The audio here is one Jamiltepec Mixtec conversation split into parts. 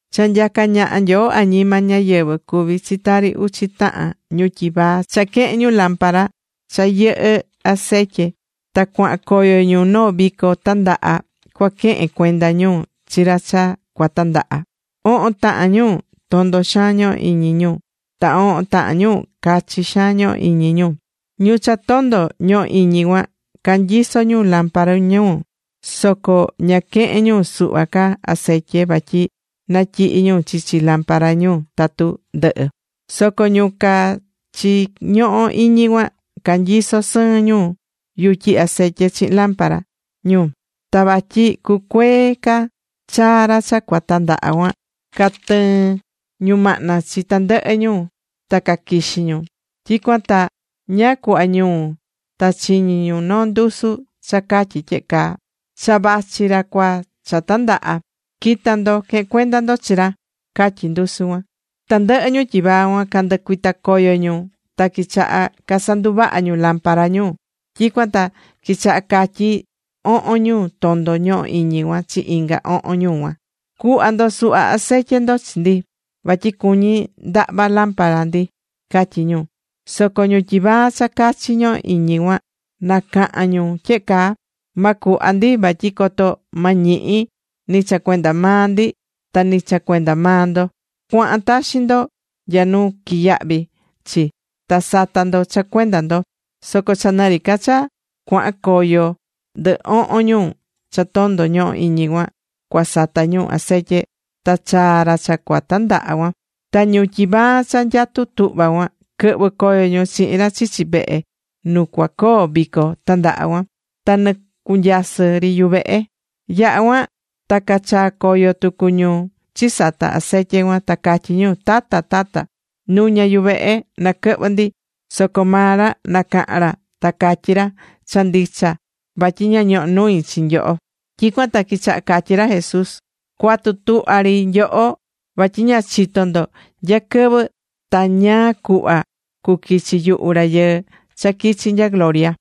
’Cha nyacá ñaha Nyoo añima ñáyɨvɨ cuví chi tari uchi tahan ñu tyivaa cha quehe̱n ñu lámpara cha yɨhɨ́ acetye ta cuahan coyo ñu noo vico tandaha cua quehen cuenda ñu chi ra cha cua tandaha. Ohon tahan ñu, tondo xaan ñohó iñi ñu, ta ohon tahan ñu cachi xaan ñohó iñi ñu. Ñu cha tondo ñohó iñi cuan, canyisó ñu lámpara ñu soco ña quehe̱n ñu suhva ca acetye vatyi natyihi ñu chichi lampara ñu tatu ndɨhɨ. Soco ñu cachi ñohó iñi cuan, canyisó sɨɨn ñu yutyi acetye chihin lámpara ñu. Ta vatyi cucuee ca chaa ra cha cua tandaha cuan, catɨɨ̱n ñumahna chi tandɨhɨ ñu, ta caquixí ñu. Tyicuan ta ñáá cuhva ñuu, ta chiñi ñu noo ndusu cha catyí tyehe caa: “¡Cha vachi ra cha cua tandaha! ¡Qui̱ta ndo, que̱hen cuenda ndo chi ra!” catyí ndusu cuan. Tandɨhɨ ñu tyivaa cuan canducuita̱ coyo ñu ta quichaha casanduvaha ñu lámpara ñu. Tyicuan ta quichaha catyí ohon ñu tondo ñohó iñi cuan chi inga ohon ñu cuan: “Cu̱hva ndo suhva acetye ndo chi ndi, vatyi cuñí ndahva lámpara ndi”, catyí ñu. Soco ñu tyivaa cha cachi ñohó iñi cuan nacahan ñu tyehe caa: “Ma cuhva ndi vatyi coto ma ñihi, ni cha cuenda maa ndi ta ni cha cuenda maa ndo. Cua̱han taxi ndo nya nu quiyahví chi, ta sa̱ta ndo cha cuenda ndo.” Soco cha nɨ ri ca cha cuahan coyo ndɨ ohon ñu cha tondo ñohó iñi cuan, cua sata ñu acetye, ta chaa̱ ra cha cua tandahá cuan. Ta ñu tyivaa cha nyatú tuhva cuan, quɨhvɨ̱ coyo ñu chihin ra chichi vehe nu cuacoo vico tandaha cuan. Ta nɨcunyasɨ̱ ri yuvehe. Yaha̱ cuan ta cachaa̱ coyo tucu ñu chisata̱ acetye cuan, ta catyí ñu: “¡Tata! ¡Tata! ¡Nu̱ña yuvehe naquɨhvɨ ndi!” Soco maa ra nacaha̱n ra, ta catyí ra: “Cha ndicha vatyi ña ñohó nui chi nyoho.” Tyicuan ta quichaha catyí ra Jesús: ―Cua̱tu tuhva ri nyoho, vatyi ña chitó ndo nya quɨvɨ ta ñáá cuhva cuquichi yuhu Rayɨɨ cha quichi Nya gloria.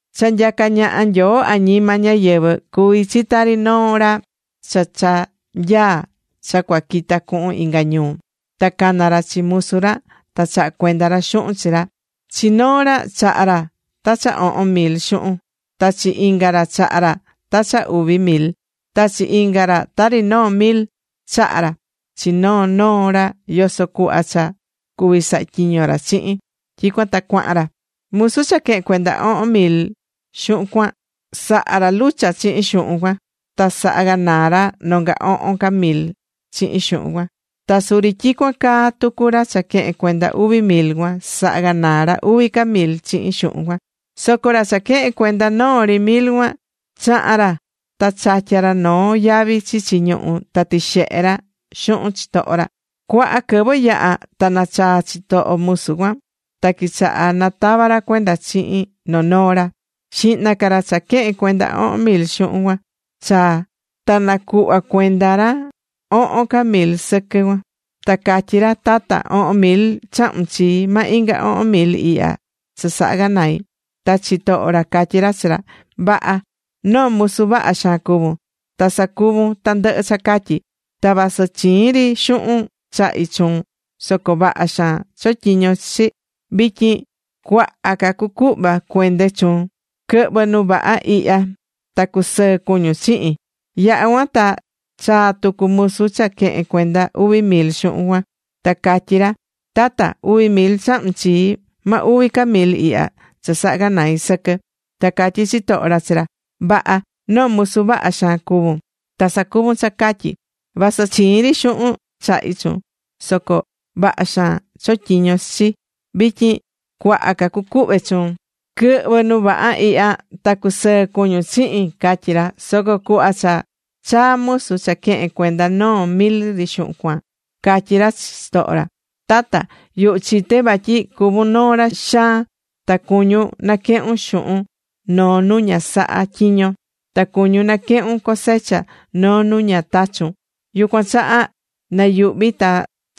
’Cha nyacá ñaha Nyoo añima ñáyɨvɨ cuví chi tari noo ra cha cha nyaá cha cua quita cuhun inga ñuu. Ta cana̱ ra chi musu ra, ta chaha̱ cuenda ra xuhun chi ra. ’Chi noo ra chaha̱ ra ta cha ohon mil xuhun, ta chi inga ra chaha̱ ra ta cha uvi mil, ta chi inga ra tari noo mil. Chaha̱ ra chi noo noo ra yoso cuhva cha cuví saha tyiño ra chihin. Tyicuan ta cuahan ra. Musu cha quehe̱n cuenda ohon mil xuhun cuan, saha̱ ra lucha chihin xuhun cuan, ta saha̱ ganaa ra nonga ohon ca mil chihin xuhun cuan. Ta suri tyicuan caa tucu ra cha quehe̱n cuenda uvi mil cuan, saha̱ ganaa ra uvi ca mil chihin xuhun cuan. Soco ra cha quehe̱n cuenda noo ri mil cuan, chaha̱n ra ta chatya̱ ra noo yavi chichi ñuhú ta tixehe̱ ra xuhun chitoho ra. ’Cuaha quɨvɨ yaha̱ ta nachaa̱ chitoho musu cuan. Ta quichaha natava ra cuenda chihin noo noo ra. Xihna ca ra cha quehe̱n cuenda ohon mil xuhun cuan chaa̱, ta nacuhva̱ cuenda ra ohon ca mil sɨquɨ cuan, ta catyí ra: “Tata, ohon mil chahu̱n chii, ma inga ohon mil ihya cha saha̱ ganai.” Ta chitoho ra catyí ra chi ra: “Vaha. Noo musu vaha xaan cuvún. Ta sacuvu̱n tandɨhɨ cha catyí. Ta vasɨ chiin ri xuhun chahi̱ chuun soco vaha xaan chotyiñon chi chi. Vityin cuaha ca cucuhva cuende chuun. Quɨ̱hvɨ nu vaha ihya, ta cusɨɨ cuñun chihin.” Yaha̱ cuan ta chaa̱ tucu musu cha quehe̱n cuenda uvi mil xuhun cuan, ta catyí ra: “Tata, uvi mil chahu̱n chii, ma uvi ca mil ihya cha saha̱ ganai sɨquɨ.” Ta catyí chitoho ra chi ra: “Vaha. Noo musu vaha xaan cuvún, ta sacuvún cha catyí. Vasɨ chiin ri xuhun chahi̱ chuun soco vaha xaan chotyiñon chi chi. Vityin cuaha ca cucuhva cuende chuun. Quɨ̱hvɨ nu vaha ihya, ta cu̱sɨɨ cuñun chihin”, catyí ra. Soco cuhva cha chaa̱ musu cha quehe̱n cuenda noo mil ri xuhun cuan, catyí ra chi chitoho ra: “Tata, yuhu chité vatyi cuvún noo ra xaan ta cuñún naquehún xuhun noo nu ña sahá tyiñon, ta cuñun naquehun cosecha noo nu ña tachu̱n. Yucuan chaha nayuhvi̱ ta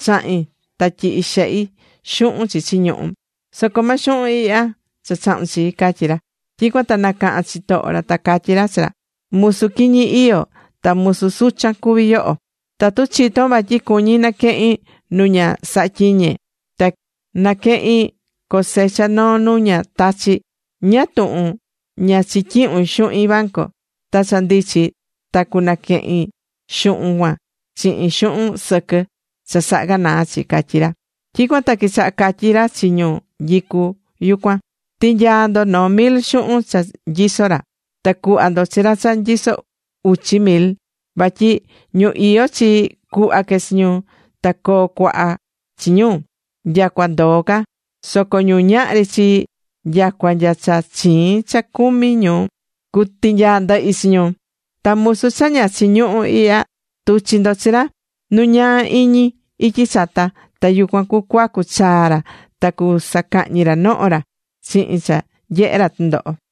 chahi̱n ta tyihi̱ xehi xuhun chichi ñuhú. Soco ma xuhun ihya cha chahu̱n chii”, catyí ra. Tyicuan ta nacaha̱n chitoho ra, ta catyí ra chi ra: “Musu quiñi iyó ta musu suchan cuví yoho. Tatu chitón vatyi cuñí naquehín nu ña saha̱ tyiñe, ta quehín cosecha noo nu ña tachí, ¿ñáá tuhun ña chityihu̱n xuhin banco? Ta cha ndichi ta, cunaquehin xuhun cuan chihin xuhun sɨquɨ cha saha̱ ganaa chi”, catyí ra. Tyicuan ta quichaha catyí ra chi ñu nyicú cuan: “Ti̱nyaa ndo noo mil xuhun cha nyisó ra, ta cu̱hva ndo chi ra cha nyisó uchi mil. Vatyi ñu iyó chii, cuhva que chi ñu, ta coo cuaha chi ñu, nyacua ndoo ca. Soco ñu ñahri chii, nyacua nya cha chiin cha cumí ñu, cutinyaa ndɨhi chi ñu. Ta musu cha ña chiñuhú ihya, tu̱chi ndo chi ra nu ñaa iñi ityi chata, ta yucuan cuacu chaa ra, ta cusacahñi ra noho ra chihin cha nyehe ra tɨndoho.”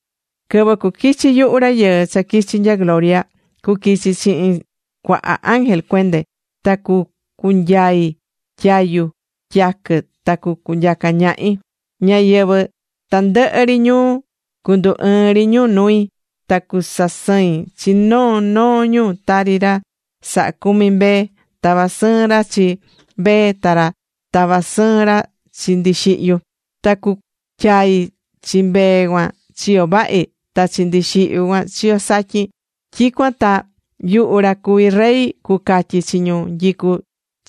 ’Quɨvɨ cuquichi yuhu Rayɨɨ cha quichi̱ nya gloria, cuquichi chihin cuaha ángel cuende, ta cucunyai tyayu tyaquɨ ta cunyaca ñahi. Ñáyɨvɨ tandɨhɨ ri ñuu cundu ɨɨn ri ñu nui. Ta cusasɨin chi noo noo ñu, tari ra sahá cumi mbee tavá sɨɨn ra chi mbee ta tava sɨɨn ra ndixihyu. Ta cucuatyai chi mbee cuan chiyo vahi, ta chi ndixihyu cuan, chiyo satyin. Tyicuan ta yuhu cha cuví Rey cucatyi chi ñu nyicú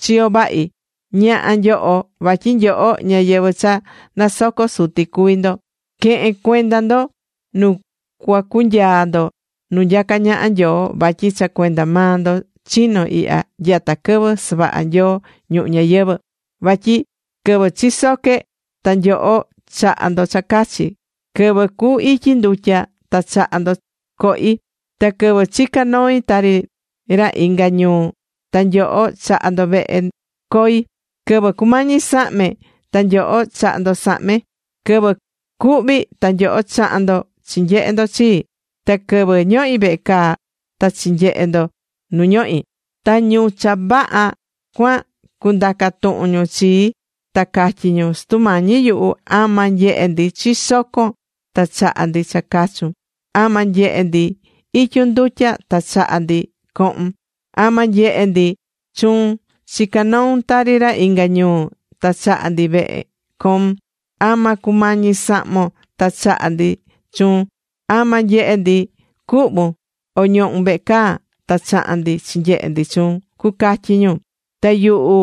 chiyo vahi: “Ña̱ha nyoho vatyi nyoho ñáyɨvɨ cha nasocó Suti cuví ndo. Que̱hen cuenda ndo nu cuacunyaa ndo nu nyacá ñaha Nyoo, vatyi cha cuenda maa ndo chino̱ ihya nyata quɨvɨ savaha̱ Nyoo ñuhu ñayɨvɨ̱. Vatyi quɨvɨ chisoque, ta nyoho chaha̱ ndo cha cachi. Quɨvɨ cu ityi ndutya ta chaha̱ ndo cohi. Ta quɨvɨ chica̱ noi tari ra inga ñuu ta nyoho chaha̱ ndo vehe coi. Quɨvɨ cumañi sahme, ta nyoho chaha̱ ndo sahme. Quɨvɨ cuhvi̱ ta nyoho chaha̱n ndo chinyehe̱ ndo chii. Ta quɨvɨ ñohi̱ vehe caa, ta quichi̱ nyehe ndo nu ñohi̱.” Ta ñu cha vaha cuan cundaca tuhun ñu chii, ta catyi ñu: “Sutu Mañi yuhu, ¿ama nyehe̱ ndi chisoco̱n, ta chaha̱ ndi cha cachun? ¿Ama nyehe̱ ndi ityun ndutya ta chaha̱ ndi cohun? ¿Ama nyehe̱ ndi chuun chicá noun tari ra inga ñuu ta chaha̱ ndi vehe coun? ¿Ama cumañi̱ sahmon, ta chaha̱ ndi chuun? ¿Ama nyehe̱ ndi cuhvún, o ñohún vehe caa, ta chaha̱n ndi chinyehe̱ ndi chuun?” cucatyi ñu. Ta yuhu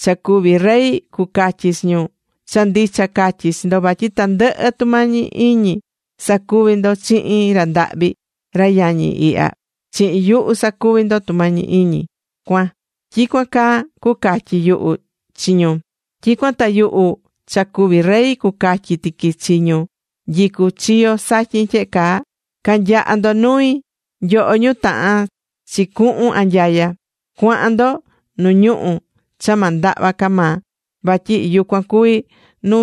cha cuví Rey cucatyi chi ñu: “Cha ndicha catyí chi ndo, vatyi tandɨhɨ tumañi iñi sacuvi̱ ndo chihin ra ndahvi, ra yañi ihya, chi yuhu sacuvi̱ ndo tumañi iñi cuan.” Tyicuan caa cucatyi yuhu chi ñu. Tyicuan ta yuhu cha cuví Rey cucatyi tiqui chi ñu nyicú chiyo satyin tyehe caa: “Ca̱nyaha ndo nui, nyoho ñu tahán chi cuhún anyaya. Cua̱han ndo nu ñuhu̱ cha ma ndahva ca maa. Vatyi yucuan cuví nu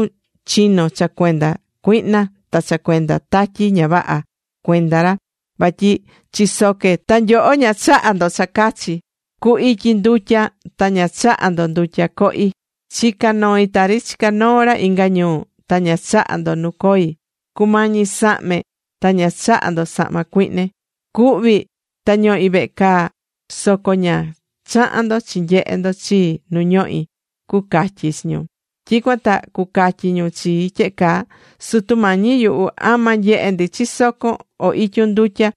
chino̱ cha cuenda cuihna ta cha cuenda tatyi ña vaha cuenda ra. Vatyi chisoque̱, ta nyoho ña chaha̱ ndo cha cachi. Cu ityi̱ ndutya, ta ña chaha̱ ndo ndutya cohi. Chica̱ noi tari chicá noo ra inga ñuu, ta ña chaha̱ ndo nu coi. Cumañi̱ sahme ta ña chaha̱ ndo sahma cuihne. Cuhvi̱ ta ñohi̱ vehe caa, soco ña chaha̱n ndo chinyehe̱ ndo chii nu ñohi̱”, cucatyi chi ñu. Tyicuan ta cucatyi ñu chii tyehe caa: “Sutu Mañi yuhu, ¿ama nyehe̱ ndi chisoco̱n, o ityun ndutya,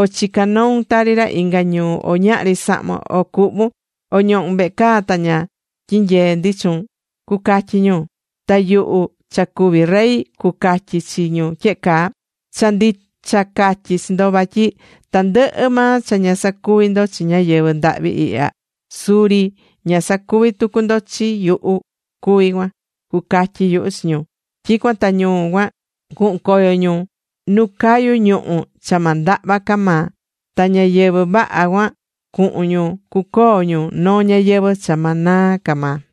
o chicán noun tari ra inga ñuu, o ñahri sahmon, o cuhvu̱n, o ñohu̱n vehe caa, ta ña tyinyee̱ ndi chuun?” cucatyi ñu. Ta yuhu cha cuví Rey cucatyi chi ñu tyehe caa: “Cha ndicha catyí chi ndo vatyi tandɨhɨ maa cha ña sacuvi̱ ndo chi ñáyɨvɨ ndahvi ihya, suri ña sacuvi̱ tucu ndo chi yuhu cuví cuan”, cucatyi yuhu chi ñu. Tyicuan ta ñu cuan cuhun coyo ñu nu cayú ñuhu̱ cha ma ndahva ca maa. Ta ñáyɨvɨ vaha cuan cuhun ñu cucoo ñu noo ñayɨvɨ̱ cha ma naa ca maa.